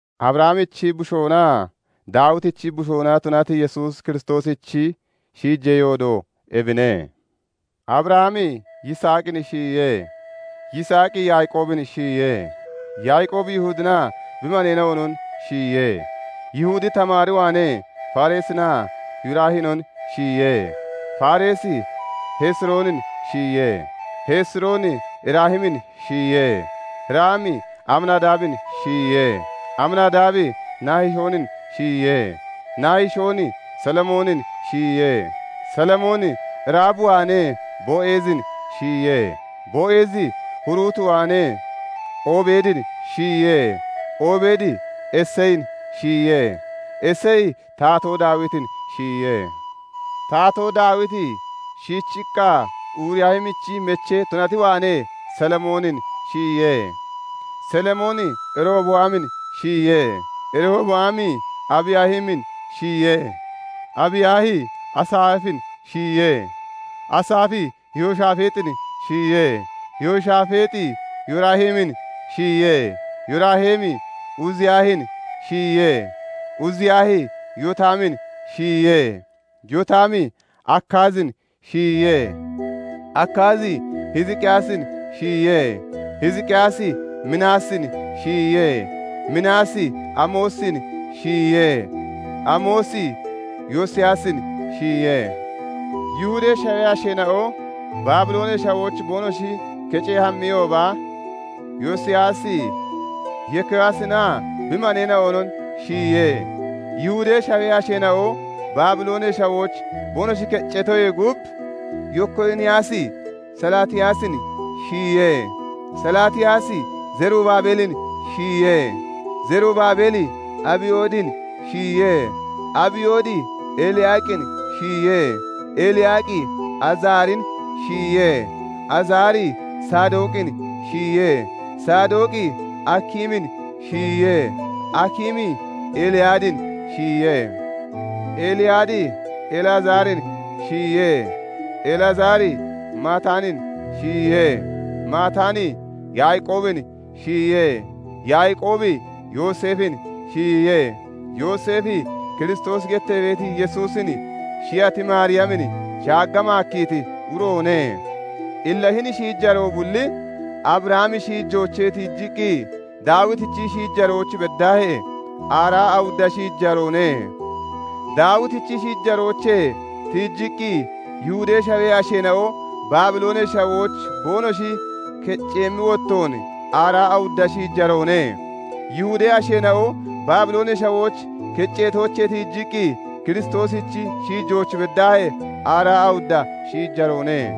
Abrahamichi bushoonaa Daawitichi bushoona tunati Yesuus Kiristoosichi shiijee yoodo ebine. Abrahami Yiisaaqin shiyiye; Yiisaaqi Yaaqoobin shiyiye; Yaaqoobi Yihudinaa bi maneena'onon shiyiye; Yihudi Tamaar waanee Fereesinaa Yeraahinon shiyiye; Fereesi Hesiroonin shiyiye; Hesirooni Raamin shiyiye; Raami Aminadaabin shiyiye; Aminadaabi Nahishoonin shiyiye; Nahishooni Salimoonin shiyiye; Salimooni Raab waanee Bo'aazin shiyiye; Bo'eezi Ruut waanee Obeedin shiyiye; Obeedi Iseyin shiyiye; Iseyi Taatoo Daawitin shiyiye. Taatoo Daawiti shiichiqqa Uriyaahichi mechee tunati waanee Solomoonin shiyiye; Solomooni Rehoboaamin shiyiye; Rehoboaami Abiyaahin shiyiye; Abiyaahi Asaafin shiyiye; Asaafi Yehoshafaaxin shiyiye; Yehoshafaaxi Yooraamin shiyiye; Yooraami Uziyaahin shiyiye; Uziyaahi Yotaamin shiyiye; Yotaami Akaazin shiyiye; Akaazi Hiziqiyaasin shiyiye; Hiziqiyaasi Minaasin shiyiye; Minaasi Amoosin shiyiye; Amoosi Yosiyaasin shiyiye; Yihudee Shawee asheena'o Baabiloonee Shawooch boonoshi kecee hammiyooba, Yosiyaasi Yekooniyaasinaa bi maneena'onon shiyiye. Yihudee Shawee asheena'o Baabiloonee Shawooch boonoshi kecceetoyee gub, Yekooniyaasi Salaatiyaasin shiyiye; Salaatiyaasi Zerubabeelin shiyiye; Zerubabeeli Abiyoodin shiyiye; Abiyoodi Eliyaaqin shiyiye; Eliyaaqi Azaarin shiyiye; Azaari Saadooqin shiyiye; Saadooqi Akiimin shiyiye; Akiimi Eliyaadin shiyiye; Eliyaadi Elaazaarin shiyiye; Elazaari Mataanin shiyiye; Mataani Yaaqoobin shiyiye; Yaaqoobi Yooseefin shiyiye; Yooseefi Kiristoosi gettee beeti Yesuusin shiyati Maariyamin shaagga maakkiiti uroone. Illa hini shiijaroo bulli, Abrahamichi shiijoochee tiijiqqi Daawitichi shiijarooch beddaahee, aaraa awudda shiijaroone; Daawitichi shiijoochee tiijiqqi Yihudee Shawee asheena'o Baabiloonee Shawooch boonoshi kecceemmi wottoon, aaraa awudda shiijaroone; Yihudee asheena'o Baabiloonee Shawooch keceetoochee tiijiqqi Kiristoosichi shiijooch beddaahee, aaraa awudda shiijaroone.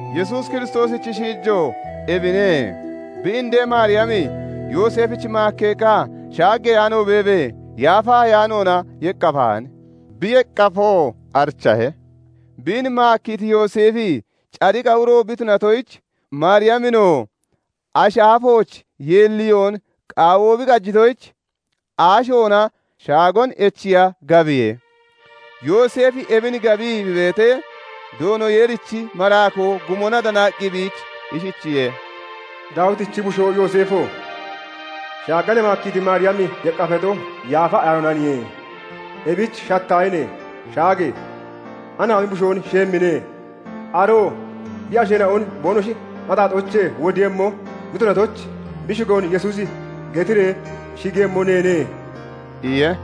Yesuus Kiristoosichi shiijo ebine:- bi indee Maariyami Yooseefich maakkeeqqa shaaggeyaano beebee, Yaafa Ayaanoona yeqqafahan; bi yeqqafoo arichahe. Biin maakkiiti Yooseefi cadiqa uro bi tunatoyich, Maariyaminoo ashi aafooch yeelliyoon qaawoo bi qajitoyich, aashoona shaagoon echiiya gabiye. Yooseefi ebin gabii bi beetee, Doono Yeerichi maraakoo gumona danaqqi biich ishichiye:- "Daawitichi bushoo Yooseefo! Shaaga ne maakkiiti Maariyami yeqqafato, Yaafa Ayaanoonaniye; ebich shattaahine! Shaage! Anaami bushoon shiyemmine; aroo bi asheena'on boonoshi axaaxoochee wodiiyemmo bi tunatoyich, bi shigoon 'Yesuusi' getiree shigiiyemmo neene" iye.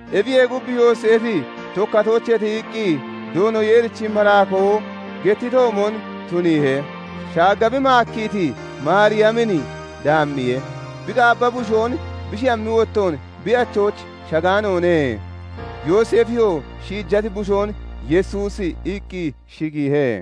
Ebiyee gub, Yooseefi tokkatoochee tiyiqqi, Doono Yeerichi maraakoo gettitoomon tuniihe; shaagga bi maakkiiti Maariyamin daammiye. Bi qaabba bushoon bi shiyammi wottoon, bi achooch shagaanoone. Yooseefiyoo shiijati bushoon "Yesuusi" iqqi shigiihe.